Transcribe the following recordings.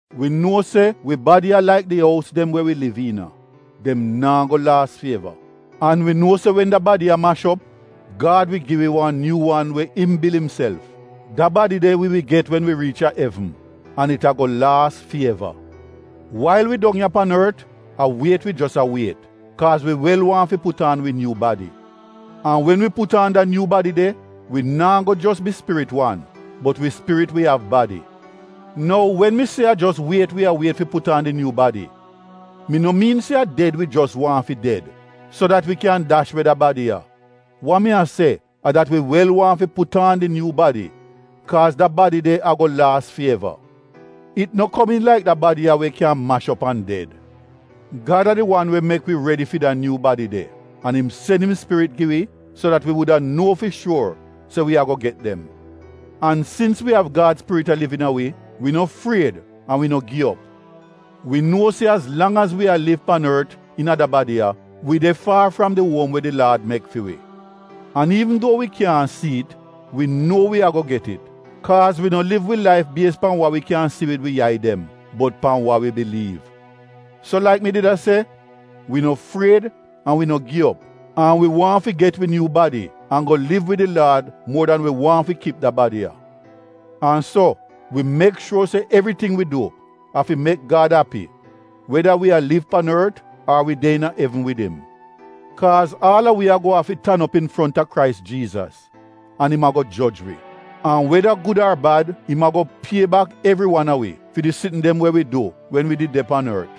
Wi nuo se wi badi a laik di ous dem we wi liv iina, dem naa go laas fi eva. An wi nuo se wen da badi ya mash op, Gad wi gi wi wan nyuu wan we im bil imself. Da badi de wi wi get wen wi riich a evn an it ago laas fi eva. Wail wi dong ya pan ort, a wiet wi jos a wiet, kaaz wi wel waahn fi put aan wi nyuu badi. An wen wi put aan da nyuu badi de, wi naa go jos bi spirit wan bot wi spirit wi av badi. Nou wen mi se a jos wiet wi a wiet fi put aan di nyuu badi, mi no miin se a ded wi jos waahn fi ded so dat wi kyan dash we da badi ya. Wa mi a se a dat wi wel waahn fi put aan di nyuu badi kaaz da badi de ago laas fi eva. It no komiin laik da badi ya we kyan mash op an ded. Gad a di wan we mek wi redi fi da nyuu badi de an im sen im Spirit gi wi so dat wi wuda nuo fi shuor se wi ago get dem. An sins wi av Gad Spirit a liv iina wi, wi no fried an wi no gi op. Wi nuo se az lang az wi a liv pan ort iina da badi ya, wi de faar fram di uom we di Laad mek fi wi. (An iivn duo wi kyaahn si it wi nuo wi ago get it kaaz wi no liv wi laif bies pan wa wi kyan si wid wi yai dem bot pan wa wi biliiv.) So laik mi did a se, wi no fried an wi no gi op, an wi waahn fi get wi nyuu badi an go liv wid di Laad muor dan wi waahn fi kip da badi ya. An so, wi mek shuor se evriting wi du a fi mek Gad api weda wi a liv pan ort ar wi de iina evn wid im. Kaaz aal a wi ago afi tan op infronta Krais Jiizas, an im ago joj wi. An weda gud ar bad, im ago pie bak evri wan a wi fi di sitn dem we wi du wen wi did de pan ort.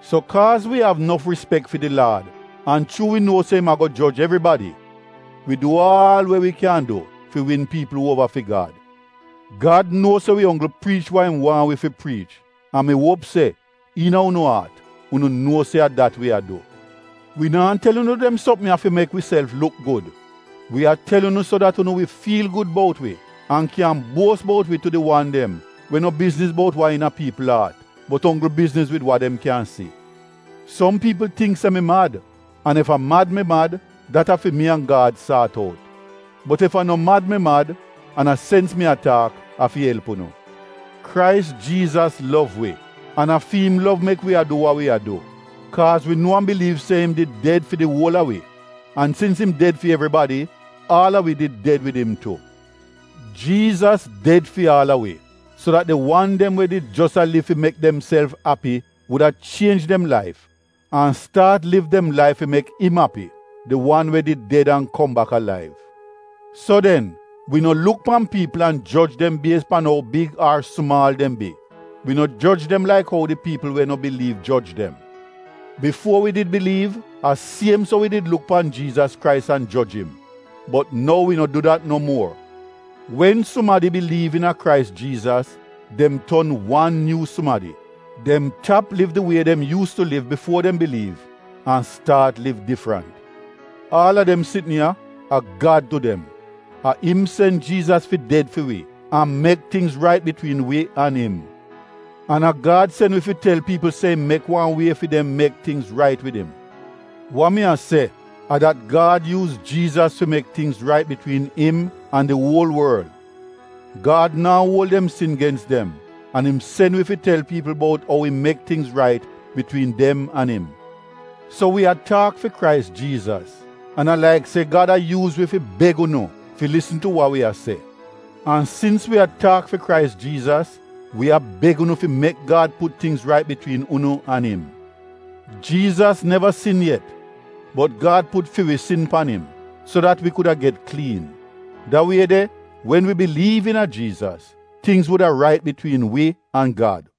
So kaaz wi av nof rispek fi di Laad an chuu wi nuo se im ago joj evribadi, wi du aal we wi kyan du fi win piipl uova fi Gad. Gad nuo se wi onggl priich wa im waahn wi fi priich an mi uop se, iina unu aat, unu nuo se a dat wi a du. Wi naa tel unu dem sopm ya fi mek wiself luk gud, wi a tel unu so dat unu wi fiil gud bout wi an kyan buos bout wi tu di wan dem we no bizniz bout wa iina piipl aat, bot onggl bizniz wid wa dem kyan si. Som piipl tingk se mi mad, an ef a mad mi mad, dat a fi mi an Gad saat out. Bot ef a no mad mi mad, an a sens mi a taak, a fi elp unu. Krais Jiizas lov wi, an a fi im lov mek wi a du wa wi a du. Kaaz wi nuo an biliiv se im did ded fi di uol a wi. An sins im ded fi evribadi, aal a wi did ded wid im tu. Jiizas ded fi aal a wi so dat di wan dem we did jos a liv fi mek demself api wuda chienj dem laif an staat liv dem laif fi mek im api — di wan we did ded an kom bak alaiv. So den, wi no luk pan piipl an joj dem bies pan ou big ar sumaal dem bi, wi no joj dem laik ou di piipl we no biliiv joj dem. Bifuo wi did biliiv, a siem so wi did luk pan Jiizas Krais an joj im, bot nou wi no du dat no muor. Wen sumadi biliiv iina Krais Jiizas, dem ton wan nyuu sumadi. Dem tap liv di wie dem yuus tu liv bifuo dem biliiv an staat liv difrant. Aal a dem sitn ya, a Gad du dem. A im sen Jiizas fi ded fi wi an mek tingz rait bitwiin wi an im. An a Gad sen wi fi tel piipl se im mek wan wie fi dem mek tingz rait wid im. Wa mi a se a dat Gad yuuz Jiizas fi mek tingz rait bitwiin im an di uol worl. Gad naa uol dem sin gens dem an im sen wi fi tel piipl bout ou im mek tingz rait bitwiin dem an im. So wi a taak fi Krais Jiizas, an a laik se Gad a yuuz wi fi beg unu fi lisn tu wa wi a se. An sins wi a taak fi Krais Jiizas, wi a beg unu fi mek Gad put tingz rait bitwiin unu an im. Jiizas neva sin yet bot Gad put fi wi sin pan im, so dat wi kuda get kliin. Da wie de wen wi biliiv iina Jiizas, tingz wuda rait bitwiin wi an Gad.